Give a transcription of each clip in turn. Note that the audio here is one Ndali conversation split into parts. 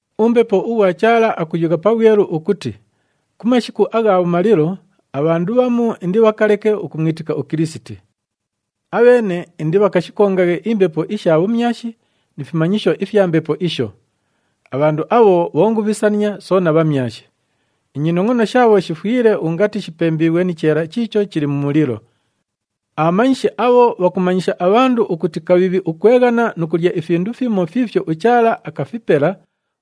UMbepo ughwa Chaala akuyugha pabhwelu ukuti ku mashiku agha bhumalilo, abhandu bhamu indibhakaleke ukumwitika uKilisiti. Abheene indibhakashikongaghe imbepo isha bhumyashi ni fimanyisho ifya mbepo isho. Abhandu abho bhongubhisania soona bhamyashi. Inyinongʼono shaabho shifwile ungati shipembiighwe ni cheela chiicho chili mu mulilo. Abhamanyishi abho bhakumanyisha abhandu ukuti kabhiibhi ukweghana nu kulya ifindu fimo fiifyo uChaala akafipela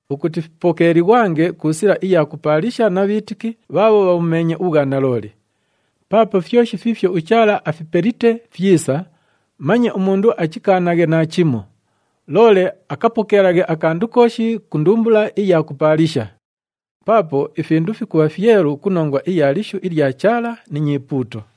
ukuti fipokeelighwange ku sila iya kupaalisha na bhiitiki bhaabho bhabhumeenye ubhwanalooli. Paapo fyoshi fiifyo uChaala afipelite fyisa, manye umundu achikaanaghe naachimo, loole akapokeelaghe akandu kooshi ku ndumbula iya kupaalisha. Paapo ifindu fikubha fyelu ku nongwa iya lishu ilya Chaala ni nyipuuto.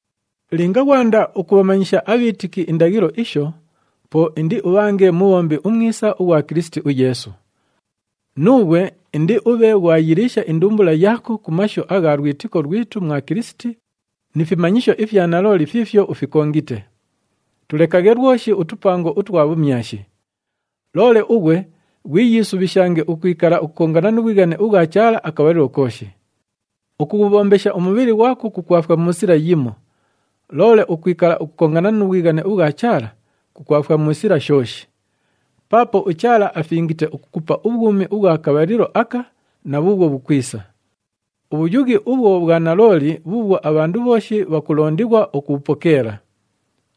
Linga ghwanda ukubhamanyisha abhiitiki indaghilo isho, po indiubhange mubhombi umwisa ughwa Kilisiti uYeesu. Nuughwe indiubhe ghwayiliisha indumbula yaako ku mashu agha lwitiko lwitu mwa Kilisiti ni fimanyisho ifya nalooli fiifyo ufikongite. Tulekaghe lwoshi utupango utwa bhumyashi. Loole ughwe ghwiyiisubhishange ukwikala ukukongana nu bhwighane ubhwa Chaala akabhalilo kooshi. “Ukughubhombesha umubhili ghwako kukwafwa mu sila yimo. Loole ukwikala ukukongana nu bhwighane ubhwa Chaala, kukwafwa mu sila shooshi. Paapo uChaala afingite ukukupa ubhwumi ubhwa kabhalilo aka na bhuubhwo bhukwisa.” Ubhuyughi ubhwo bhwa nalooli bhuubhwo abhandu bhooshi bhakulondighwa ukubhupokeela.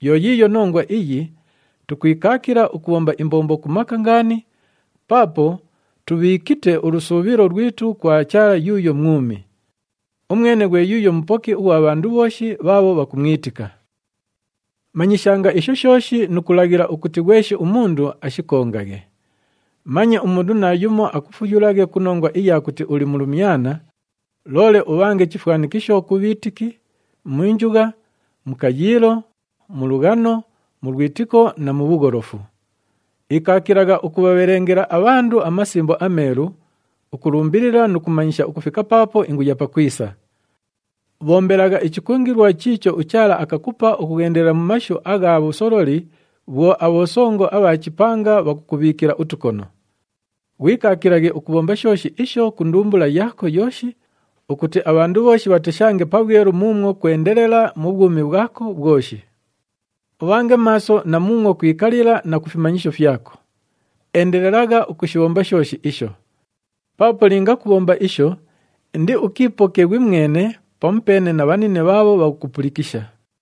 Yo yiiyo nongwa iyo tukwikaakila ukubhomba imbombo ku maka ngaani paapo tubhiikite ulusuubhilo lwitu kwa Chaala yuuyo mwumi. Umwene ghwe yuuyo Mupoki ughwa bhandu bhooshi bhaabho bhakumwitika. Manyishanga isho shooshi nu kulaghila ukuti ghweshi umundu ashikongaghe. Manye umundu naayumo akufuyulaghe ku nongwa iya kuti uli mulumyana, loole ubhange chifwanikisho ku bhiitiki, mu njugha, mu kayiilo, mu lughano, mu lwitiko na mu bhugholofu. Ikaakilagha ukubhabhelengela abhandu aMasimbo aMeelu, ukulumbilila nu kumanyisha ukufika paapo inguya pakwisa. Bhombelagha ichikungilwa chiicho uChaala akakupa ukughendela mu mashu agha bhusololi bhwo abhosongo abha chipanga bhakukubhiikila utukono. Ghwikaakilaghe ukubhomba shooshi isho ku ndumbula yaako yooshi ukuti abhandu bhooshi bhateshange pabhwelu muumwo kwendelela mu bhwumi bhwako bhwoshi. Ubhange maaso na muumwo kwikalila na ku fimanyisho fyako. Endelelagha ukushibhomba shooshi isho. Paapo linga kubhomba isho indiukiipoke ghwimwene pamupeene na bhanine bhaabho bhakukupulikisha.